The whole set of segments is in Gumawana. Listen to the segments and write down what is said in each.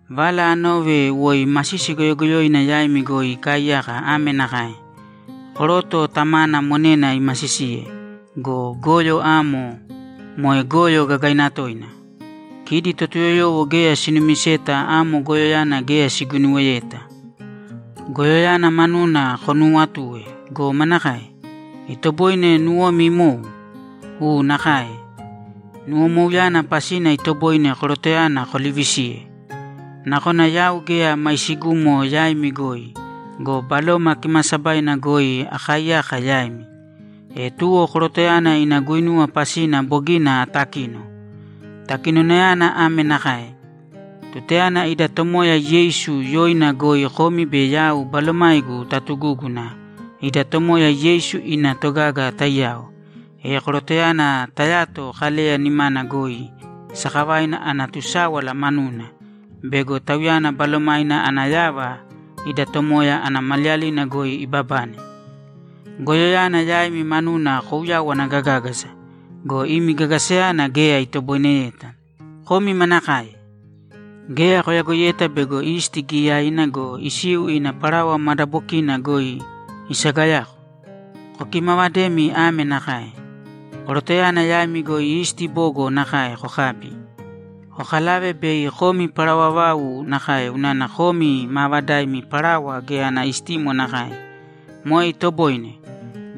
Vala anove woi masisi goyogoyoina yaimi goi ikaaiyaka ame nakae: Koroto tamana monena imasisiye go, goyo amo moe goyo gagaina toina. Kidi Totuyoyowo geya sinumiseta amo goyoyana geya siguinuweyeta! Goyoyana manuna konuuwatue go, manakae? Itoboine nuwomi imou? U nakae. Nuwomouyana pasina itoboine korotoyana kolivisiye! Nakona yau geya maisigumo yaimi goi go, Baloma Kimaasabaina goi akaaiyaka yaimi. E tuwo korotoyana ina guinuwa pasina bogina atakino. Takinonayana ame nakae: Tutayana ida Tomoya Yeisu yoina goi komi be yau balomaigu tatugúguna ida Tomoya Yeisu ina togaga taiyao, e korotoyana tayato Kaleya nimana goi sakavaina ana tusáwala manuna bego tauyana balomaina ana yava ida Tomoya ana maliyalina goi ibabane. Goyoyana yaimi manuna kouyawana gagágasa go, imi gagasayana geya itoboineyeta. Komi manakae! Geya koyagoiyeta bego isti giyaina go, isiu ina parawa madabokiina goi isagayako? Kokimavadēmi ame nakae: Korotoyana yaimi goi isti bogo nakae kokābi, kokalāve bei komi parawa vau nakae unana komi maavadaimi parawa geya ana istimo nakae. Moe itoboine.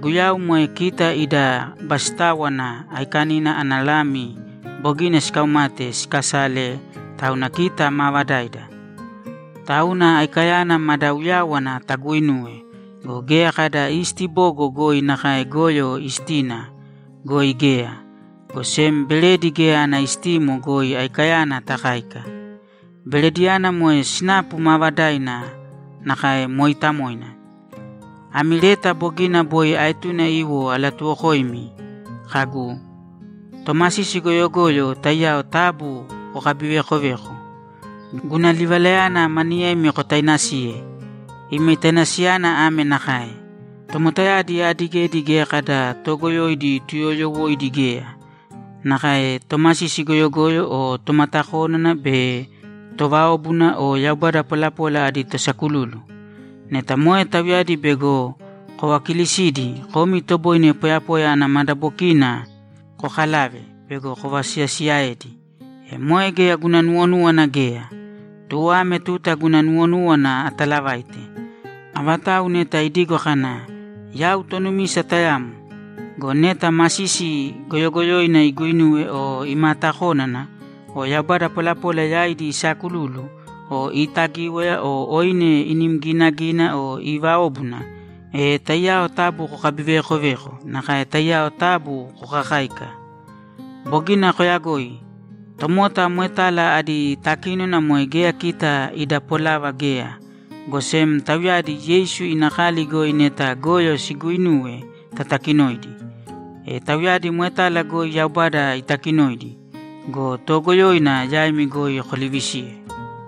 Guyau moe kita ida Basitáwana Aikanina ana lami bogina sikaumate sikasale, tauna kita maavadaida. Tauna aikayana mada uyáwana taguinūwe go, geya kada isti bogo goi nakae goyo istina goi geya, go sem beredi geya ana istimo goi aikayana takāika. Berediyana moe sinapu maavadaina nakae mooitamoina. Ami leta bogina boi aetune iwo alatuwokoimi kagu, ‘Tomasisi goyogoyo taiyao taabu kokabiveekovēko.’ Guna livalayana maniyemi kotainasiye. Imi tainasiyana ame nakae: Tomotayadi aadigedi geya kada toogoyoidi tuyooyowoidi geya, nakae tomasisi goyogoyo o tomatakónana be továobuna o yaubada polapola adi tosakululu. Neta moe tauyadi bego kovakilisidi, komi itoboine poyapoya ana madabokiina kokalave bego kovasiyasiyaedi. E moe geya guna nuwonúwana geya. Tuwo ame tuta guna nuwonúwana atalavaite. Avatau neta idigo kana, ‘Yau tonumisa tayamo’ go, neta masisi goyogoyoina iguuinuwe o imaatakónana o yaubada polapola yaidi isaakululu o iitagíwaya o oine inim ginagina o iiváobuna, e taiyao taabu kokabiveekovēko nakae taiyao taabu kokakāika. Bogina koyagoi. Tomota moetala adi takínona moe geya kita ida polava geya, go sem tauyadi Yeisu ina kali goi neta goyo siguuinuwe tatakinōidi. E tauyadi moetala goi Yaubada itakinoidi go, toogoyoina yaimi goi kolivisīye.